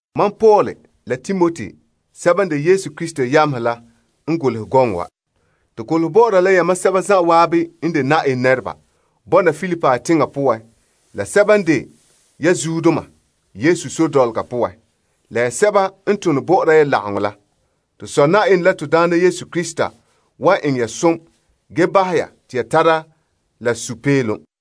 Mam Paul la Timoti sɛba n de Yesu Krista yamehe la n golehɛ gɔŋɔ wa. To golehɛ bɔ'ɔra la yamam sɛba zan'an n de Yenɛ nɛreba, bɔna Filipi teŋa poan la sɛba n de ya zuodoma Yesu sore dɔlɔga poan, la ya sɛba n tone bɔ'ɔra ya lagaŋɔ la. To Sɔ Yenɛ la Na'ayenɛ Yesu Krista wan eŋɛ ya som ge bahɛ ya te ya tara la popeelom.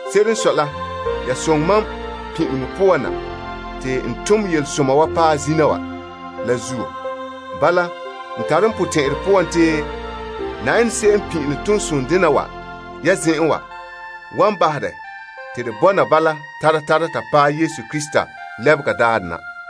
Se'ere n sɔe la, yan soŋɛ mam pin'ileŋɔ poan na te n mɔɔlɛ yelesoma la wa paɛ zina wa. Bala, n tare n potɛn'ɛrɛ poan te Yenɛ se'em n pin'ilom toonsonɛ dena wa ya zen'en wa wan bahɛ dɛ te de bɔna bala tara tara ta paɛ Krista Yesu lebega daarɛ na.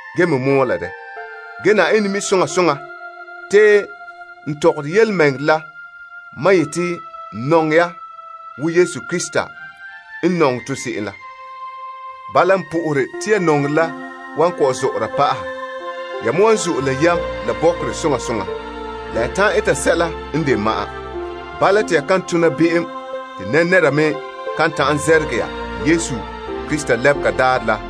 Ge Yenɛ mi' soŋa soŋa te n tɔgɔre yelemɛŋɛrɛ la mam yeti n nɔŋɛ ya wo Krista Yesu n nɔŋɛ to se'em la. Bala, n po'ohere te ya nɔŋerɛ la wan kɔ'ɔn zɔ'ɔra pa'aha. Ya me wan zo'e la yam la bɔkerɛ soŋa soŋa, la ya ta'an eta sɛla n de ma'an. Bala te ya kan tona be'em ge kan tara zɛrɛgɛ Krista daarɛ la,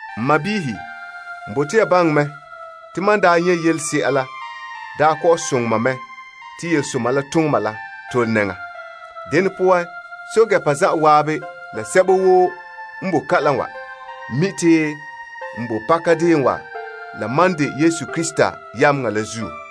N sɔɔnrɔ, n bote ya baŋɛ mɛ te mam n daa nyɛ' yelese'a la daa kɔ'ɔn soŋɛ mɛ te yelesoma tooma la tole nɛŋa. Dene poan, pɛɛntɛɛnreba la zan'an la sɛba woo n boe kalam wa mi' te n bo pakadeen wa la mam de Krista yameŋa la zuo.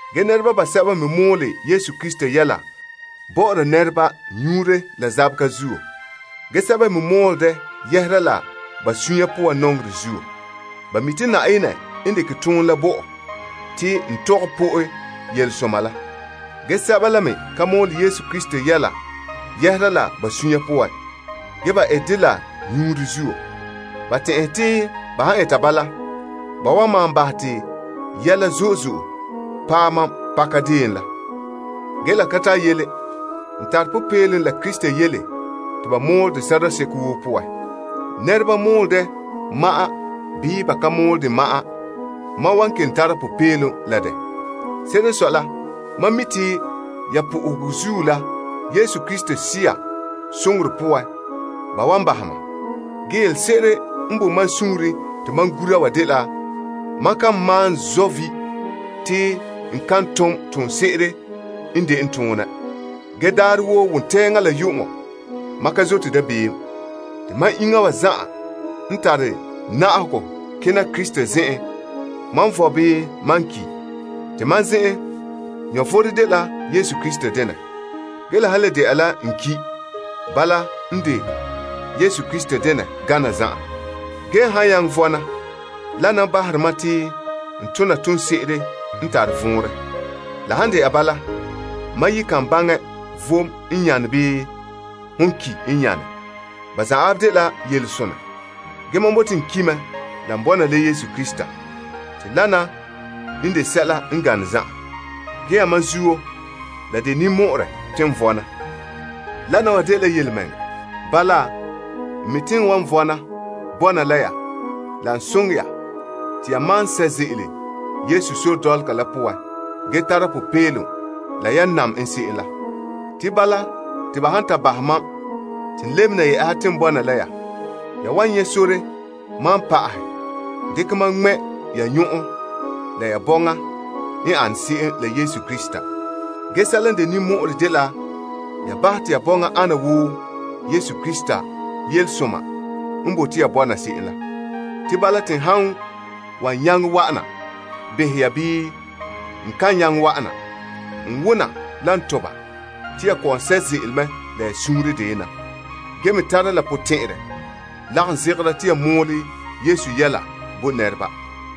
Ge nɛreba basɛba me mɔɔla Krista yɛla bɔ'ɔra nɛreba nyuunre la zaba zuo. Ge sɛba me mɔɔlɛ dɛ yɛhera la ba suunre poan nɔŋerɛ zuo. Ba mi' te Yenɛ n dekɛ toonɛ la bo mam te n tɔgɛ po'e yelesoma la. Ge sɛba la me ka mɔɔlɛ Krista yɛla yɛhera la ba sunya poan. Ge ba ete dɛ la nyika zuo. Ba tɛn'ɛhe te ba han eta bala, ba wan maan bahɛ te yɛla zo'e zo'e paɛ mam pakadeen la. Ge la ka tare yele. N tare popeelom la Krista yele te ba dekɛ mɔɔlɛ te sɔrɔɔ seko woo poan. Nɛreba mɔɔlɛ dɛ ma'an bii ba ka mɔɔlɛ dɛ ma'an, mam wan kelom tara popeelom la dɛ. Se'ere n sɔe la, mam mi' te ya po'ohegɔ zuo la Yesu Krista Sea soŋorɛ poan ba wan bahɛ mam. Ge yelese'ere n boe mam suunren te mam gura wa dela mam kan malom zɔ' vi' te n kan tom toonse'ere n de n tone. Ge saŋa woo, pon sɔna nananawa, mam kan zɔta dabeem. Ge mam iŋa wa zan'an, wan tara na'ahegɔ kena Krista zen'en, n vom bii n kum. Te mam zen'an, vom dela Krista denɛ. Ge la han le dɛna la n ki', bala n de Yesu Krista denɛ gana zan'an. Ge n han nyaŋɛ vɔna, dena n bahere mam te n tona toonse'ere n tare vɔnrɛ. La han dɛna bala, mam yi kan baŋɛ vom n nyane bii hon ki' n nyane. Ba zan'an dela yelesonɛ. Ge mam bote n ki' mɛ la n bɔna la Yesu Krista. Te dena n de sɛla n gane zan'an. Ge yamam zuo la de ninmɔ'ɔrɛ te n vɔna. Dena wa dela yelemɛŋɛrɛ. Bala, n mi' te n wan vɔna bɔna la ya la n soŋɛ ya te ya maan sɛ' ze'ele Yesu sore dɔlɔga la poan ge tara popeelom la yan nam n se'em la. Te bala, te ba han ta bahɛ mam te n lebena te n bɔna la ya, ya wan nyɛ' sore malom pa'ahɛ, ge dekɛ mam ŋmɛ' ya nyɔn'ɔn la ya bɔŋa n ane se'em la Yesu Krista. Ge sɛla n de ninmɔ'ɔrɛ dela ya bahɛ te ya bɔŋa ana wo Krista yelesoma n bote ya bɔna se'em la. Te bala, te n han wan nyaŋɛ wa'ana behɛ ya bii, n kan nyaŋɛ wa'ana, n wona la n toba te ya kɔ'ɔn sɛ' ze'ele mɛ la suunre deyena. Ge me tara la potɛn'ɛrɛ lagom zegera te ya mɔɔlɛ Yesu yɛla bo nɛreba.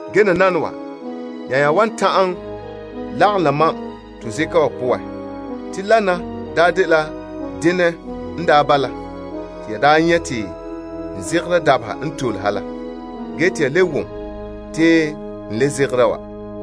Nananawa, ya nya wan ta'an lagom la mam te to zabe. Zabe denɛ n bala te ya daa nyɛ' te n zabera dabeha n tole ha la, ge te ya le wom te n kelom zabera wa.